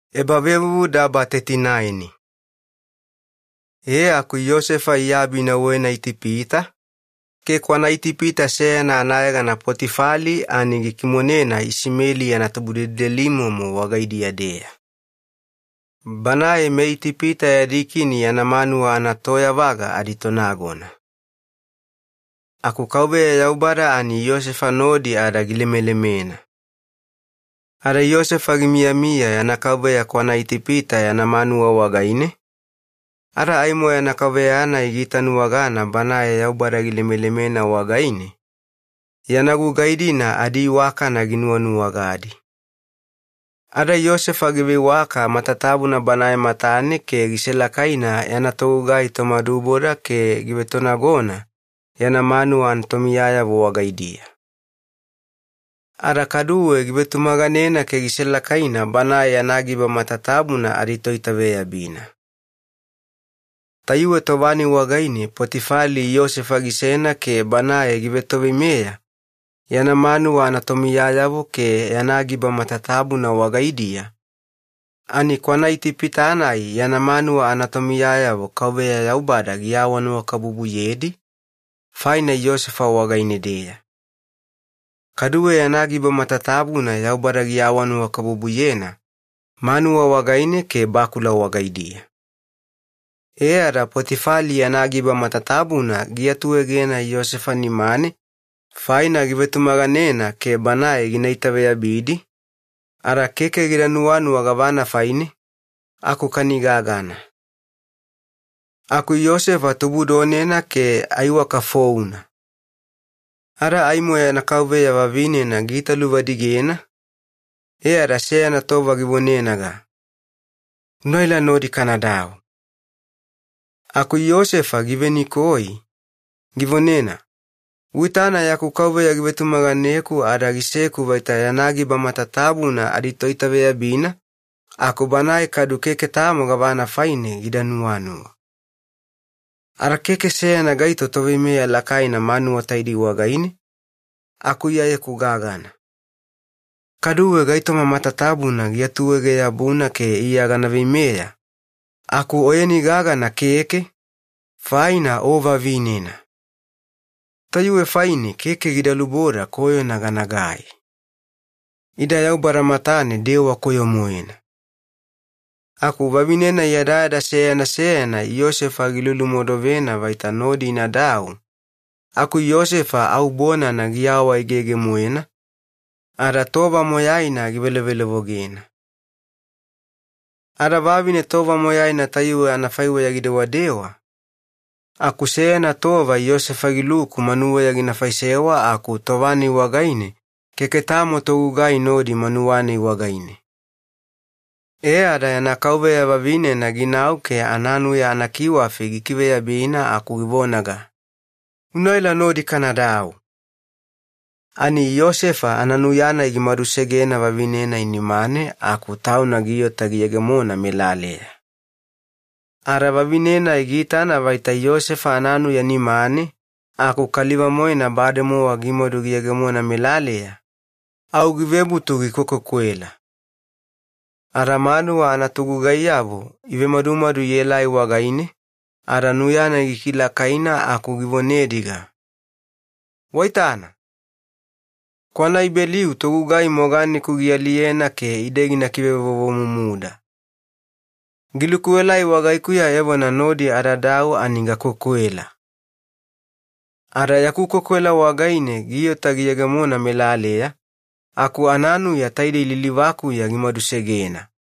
Yosefa ivekimoneyena Potifali wagaine. E aku Yosefa iabi inauwena Itipita, ke kwanaItipita seyana anayegana Potifali ani gikimonena Isimeli yana tubudelidelimomo wagaidiya-deya. Banae meItipita adikini yana manuwa anatoyavaga aditonagona. Aku Yaubada ani Yosefa nodi ada gilemelemena. Ada Yosefa gimiyamiya yana kauveya kwanaItipita yana manuwa wagaine, ada aimo yana kauveya-nai giitanuwagana banae Yaubada gilemelemena wagaine, yana gugai-dina adiiwakana ginuwanuwagadi. Ada Yosefa giveiwaka matatabuna banae matane ke giselakaina yana togugai tomaduboda ke givetonagona yana manuwa anatomiyayavo wagaidiya. Ada kaduwe givetumaganena ke giselakaina banae yana giba matatabuna aditoitaveyabina. Tayuwe tova-nai wagaine Potifali Yosefa gisena ke banae givetoveimeya yana manuwa anatomiyayavo ke yana giba matatabuna wagaidiya, ani kwanaItipita-nai yana manuwa anatomiyayavo Yaubada givebutu gilemelemedi faina Yosefa wagaine-deya. Ada Yaubada gilemelemena yana giba matatabuna, manuwa negenine ke bakula wagaidiya. E ada Potifali yana giba matatabuna giatuegena Yosefa nimane faina givetumaganena ke banae gina itaveyabidi, ada keke gida nuwanuwa gavana faine, aku kani gagana. Aku Yosefa tubudonena ke aiwaka founa. Ada aimo yana kauveya vavinena giitaluvadigena, e ada seyana tova givonenaga, “Unaela, nodi kanadau.” Aku Yosefa givenikoi, givonena, “Uitana yaku kauveya givetumaganeku ada giseku vaita yana giba matatabuna aditoitaveyabina aku banae kadu keke tamo gavana faine gida nuwanuwa. Ada keke seyana gaito toveimeya lakaina manuwa taidei wagaine, aku iyayeku gagana. Kaduwe gaitoma matatabuna giatuege-yabuna ke iya gana veimeya, aku oyeni gagana keke, faina o vavinena. Tayuwe faine keke gida luboda koyona ganagai. Ida Yaubada matane dewa koyo-moena.” Aku vavine-nai yadayada seyana seyana Yosefa gilulumodovena vaita nodi inadau, aku Yosefa au bonana giawaegege-moena, ada tova moyaina givelovelovogena. Ada vavine tova moyaina tayuwe anafaiweya gidewadewa, aku seyana tova Yosefa giluku manuweya gina faisewa aku tova-nai wagaine keke tamo togugai nodi manuwa-nai wagaine. E ada yana kauveya vavinena ginau ke ananuya anakiwafi gikiveyabina aku givonaga, “Unaela nodi kanadau!” Ani Yosefa ananuya-nai gimadusegena vavine-nai nimane aku tauna giota giyegemona melaleya. Ada vavine-nai giitana vaita Yosefa ananuya nimane aku kaliva-moena bademowa gimadu giyegemona melaleya, au givebutu gikwekwekwela. Ada manuwa anatogugaiyavo ivemadumadu ielai wagaine ada nuya-nai gikilakaina aku givonediga, “Waitana! KwanaIbeliu togugai moganeku gialiyena ke ide gina kivevovomumuda. Giluku-elai wagaikuya evona nodi adadau ani gakwekwela. Ada yaku kwekwela wagaine giota giyegemona melaleya, aku ananuya taidei lilivakuya gimadusegena!”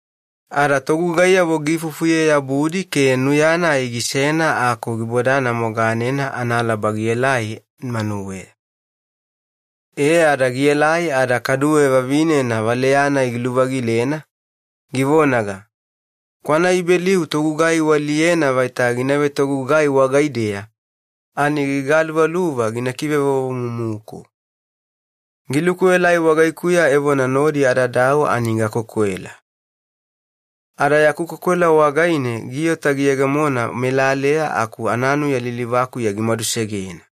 Ada togugaiyavo giifufuye-yabudi ke nuya-nai gisena aku gibodana moganena analaba gielai manuweya. E ada gielai ada kaduwe vavinena valeya-nai giluvagilena, givonaga, “KwanaIbeliu togugai ualiyena vaita gina vetogugai wagaideya ani gigaluvaluva gina kivevovomumuku. Giluku-elai wagaikuya evona nodi adadau ani gakwekwela. Ada yaku kwekwela wagaine giota giyegemona melaleya aku ananuya lilivakuya gimadusegena!”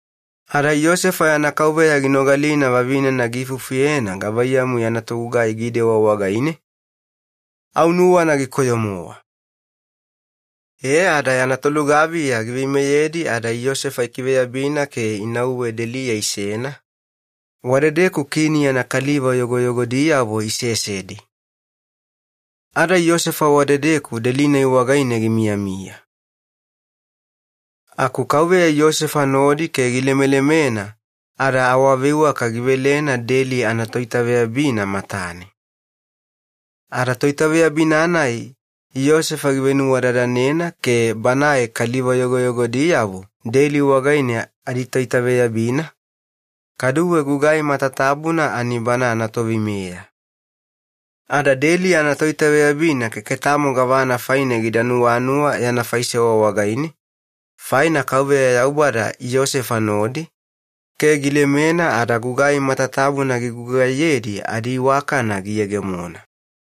Ada Yosefa yana kauveya ginogalina vavinena giifufuyena gavaiyamu yana togugai gidewa wagaine, au nuwana gikoyo-mowa. E ada yana tolugaviya giveimeyedi ada Yosefa ikiveyabina ke inauwe deliya isena, wadedeku kini yana kaliva yogoyogodiyavo isesedi. Ada Yosefa wadedeku deli-nai wagaine gimiyamiya. Aku Yaubada Yosefa nodi ke gilemelemena e ada giveiwaka matatabuna deli anatoitaveyabina matane. Ada toitaveyabina-nai Yosefa givenuwadadanena ke banae kaliva yogoyogodiyavo deli wagaine aditoitaveyabina kaduwe gugai matatabuna bana anatoveimeya. Ada deli anatoitaveyabina keke tamo gavana faine gida nuwanuwa yana faisewa wagaine, faina Yaubada Yosefa nodi ke gilemena ada gugai matatabuna gigugaiyedi adiiwakana giyegemona.